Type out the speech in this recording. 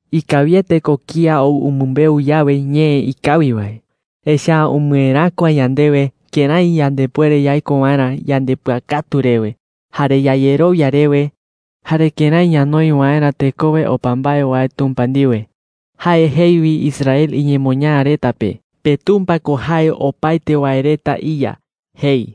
7Ikawiete ko kía ou umɨmbeu yawe ñee ikawi wae. Echa’ä umɨeräkua yandewe kërái yandepuere yaiko waerä yandepɨakatu rewe, jare yayerowia rewe, jare kërái ñanoi waerä tekowe opa mbae wae Tumpa ndiwe. Jae jei wi Israel iñemoñaa reta pe: “PeTumpa ko jae opaete wae reta iYa,” jei.